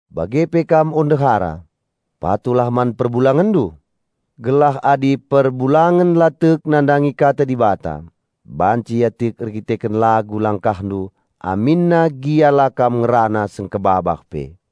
Bage pe kam o ndehara, patuhlah man perbulangenndu, gelah adi perbulangen la tek nandangi Kata Dibata, banci ia tek erkiteken lagu langkahndu aminna gia la kam ngerana sengkebabah pe,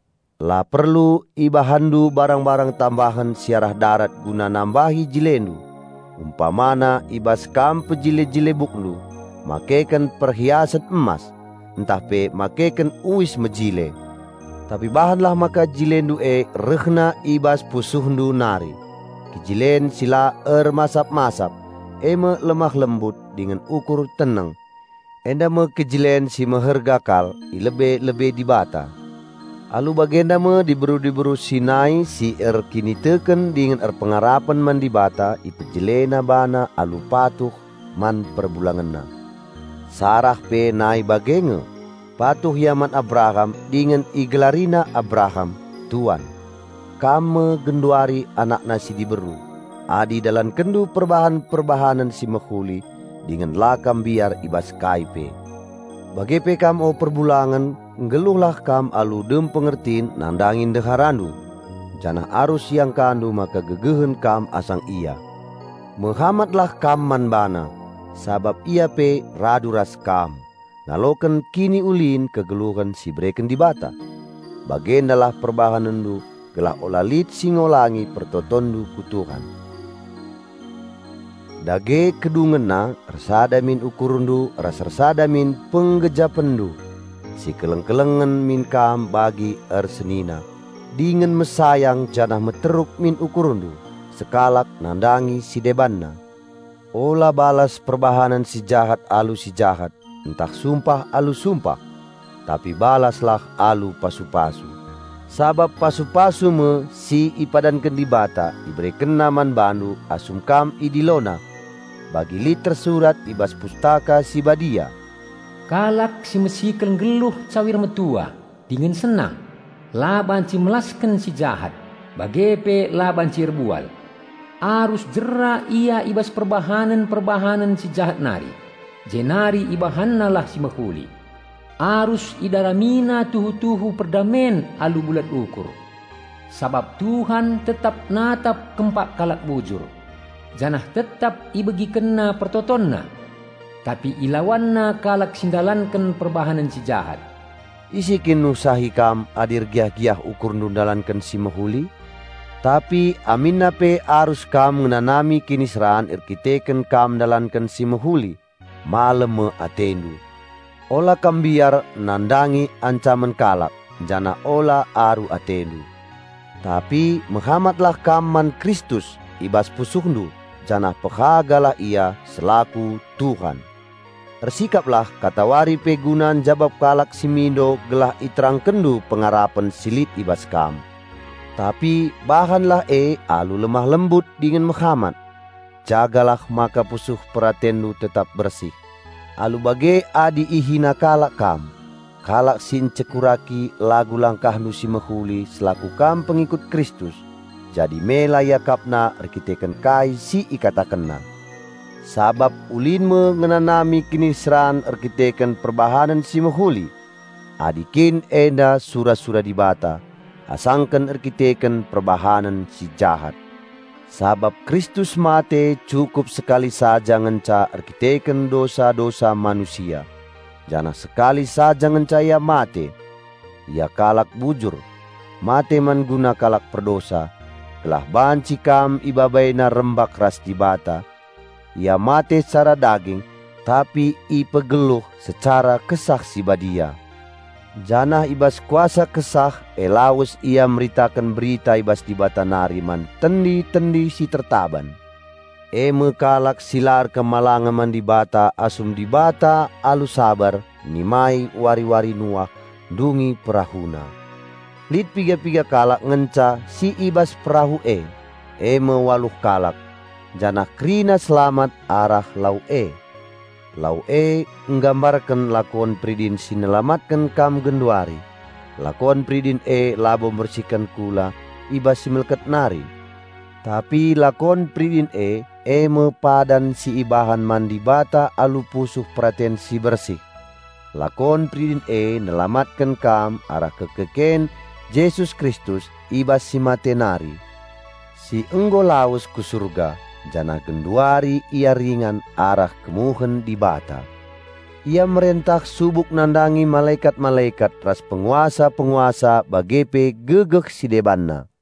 La perlu ibahanndu barang-barang tambahen si arah darat guna nambahi jilendu, umpamana i bas kam pejile-jile bukndu, makeken perhiasen emas, ntah pe makeken uis mejile. Tapi bahanlah maka jilendu e rehna i bas pusuhndu nari, kejilen si la ermasap-masap, e me lemah lembut dingen ukur teneng. Enda me kejilen si meherga kal i lebe-lebe Dibata. Alu bagenda me diberu-diberu si nai si erkiniteken dingen erpengarapen man Dibata ipejilena bana alu patuh man perbulangenna. Sarah pe nai bage nge, patuh ia man Abraham dingen igelarina Abraham, "Tuan". Kam me genduari anakna si diberu, adi idalankenndu perbahanen-perbahanen si mehuli dingen la kam mbiar i bas kai pe. Bage pe kam o perbulangen nggeluhlah kam alu dem pengertin nandangi ndeharandu, janah arus iangkandu maka gegehen kam asang ia. Mehamatlah kam man bana, sabap ia pe radu ras kam, ngaloken kiniulin kegeluhen si ibereken Dibata. Bagendalah perbahanenndu gelah ula lit si ngolangi pertotonndu ku Tuhan. Dage kedungenna ersada min ukurndu ras ersada min penggejapenndu. Sikeleng-kelengen min kam bagi ersenina, dingen mesayang janah meteruk min ukurndu sekalak nandangi si debanna. Ula balas perbahanen si jahat alu si jahat, ntah sumpah alu sumpah. Tapi balaslah alu pasu-pasu, sabap pasu-pasu me si ipadanken Dibata IberekenNa man bandu, asum kam IdiloNa. Bagi lit tersurat i bas Pustaka Si Badia, "Kalak si mesikel nggeluh cawir metua dingen senang, la banci melasken si jahat, bage pe la banci erbual. Arus jera ia i bas perbahanen-perbahanen si jahat nari, jenari ibahannalah si mehuli; arus idaramina tuhu-tuhu perdamen alu bulat ukur. Sabap Tuhan tetap natap kempak kalak bujur, janah tetap IbegikenNa pertotonna; tapi IlawanNa kalak si ndalanken perbahanen si jahat." Ise kin nuhsahi kam adi ergiah-giah ukurndu ndalanken si mehuli? Tapi aminna pe arus kam ngenanami kiniseran erkiteken kam ndalanken si mehuli, malem me atendu! Ula kam mbiar nandangi ancamen kalak janah ula aru atendu. Tapi mehamatlah kam man Kristus i bas pusuhndu, janah pehagalah Ia selaku Tuhan. Ersikaplah katawari pe guna njabap kalak si mindo gelah iterangkenndu pengarapen si lit i bas kam. Tapi bahanlah e alu lemah lembut dingen mehamat. Jagalah maka pusuh peratenndu tetap bersih. Alu bage adi ihina kalak kam, kalak si ncekuraki lagu langkahndu si mehuli selaku kam pengikut Kristus, jadi mela iakapna erkiteken kai si ikatakenna. Sabap ulin me ngenanami kiniseran erdandanken perbahanen si mehuli, adi kin enda sura-sura Dibata, asangken erdandanken perbahanen si jahat. Sabap Kristus mate cukup sekali saja ngenca erkiteken dosa-dosa manusia, janah sekali saja ngenca Ia mate. Ia kalak bujur, mate man guna kalak perdosa, gelah banci kam IbabaiNa rembak ras Dibata. Ia mate secara daging, tapi ipegeluh secara Kesah Si Badia. Janah i bas kuasa Kesah e lawes Ia meritaken berita i bas Dibata nari man tendi-tendi si tertaban, eme kalak si la patuh man Dibata asum Dibata alu saber nimai wari-wari Nuah ndungi perahuna. Lit piga-piga kalak ngenca si i bas perahu e, e me waluh kalak; janah kerina selamat arah lau e. Lau e nggambarken lakon peridin si nelamatken kam genduari. Lakon peridin e labo mbersihken kula i bas si melket nari, tapi lakon peridin e, e me padan si ibahan man Dibata alu pusuh peraten si bersih. Lakon peridin e nelamatken kam arah kekeken Jesus Kristus i bas si mate nari, si nggo lawes ku surga, janah genduari Ia ringan arah kemuhen Dibata. Ia merentah subuk nandangi malekat-malekat ras penguasa-penguasa bage pe gegeh si debanna.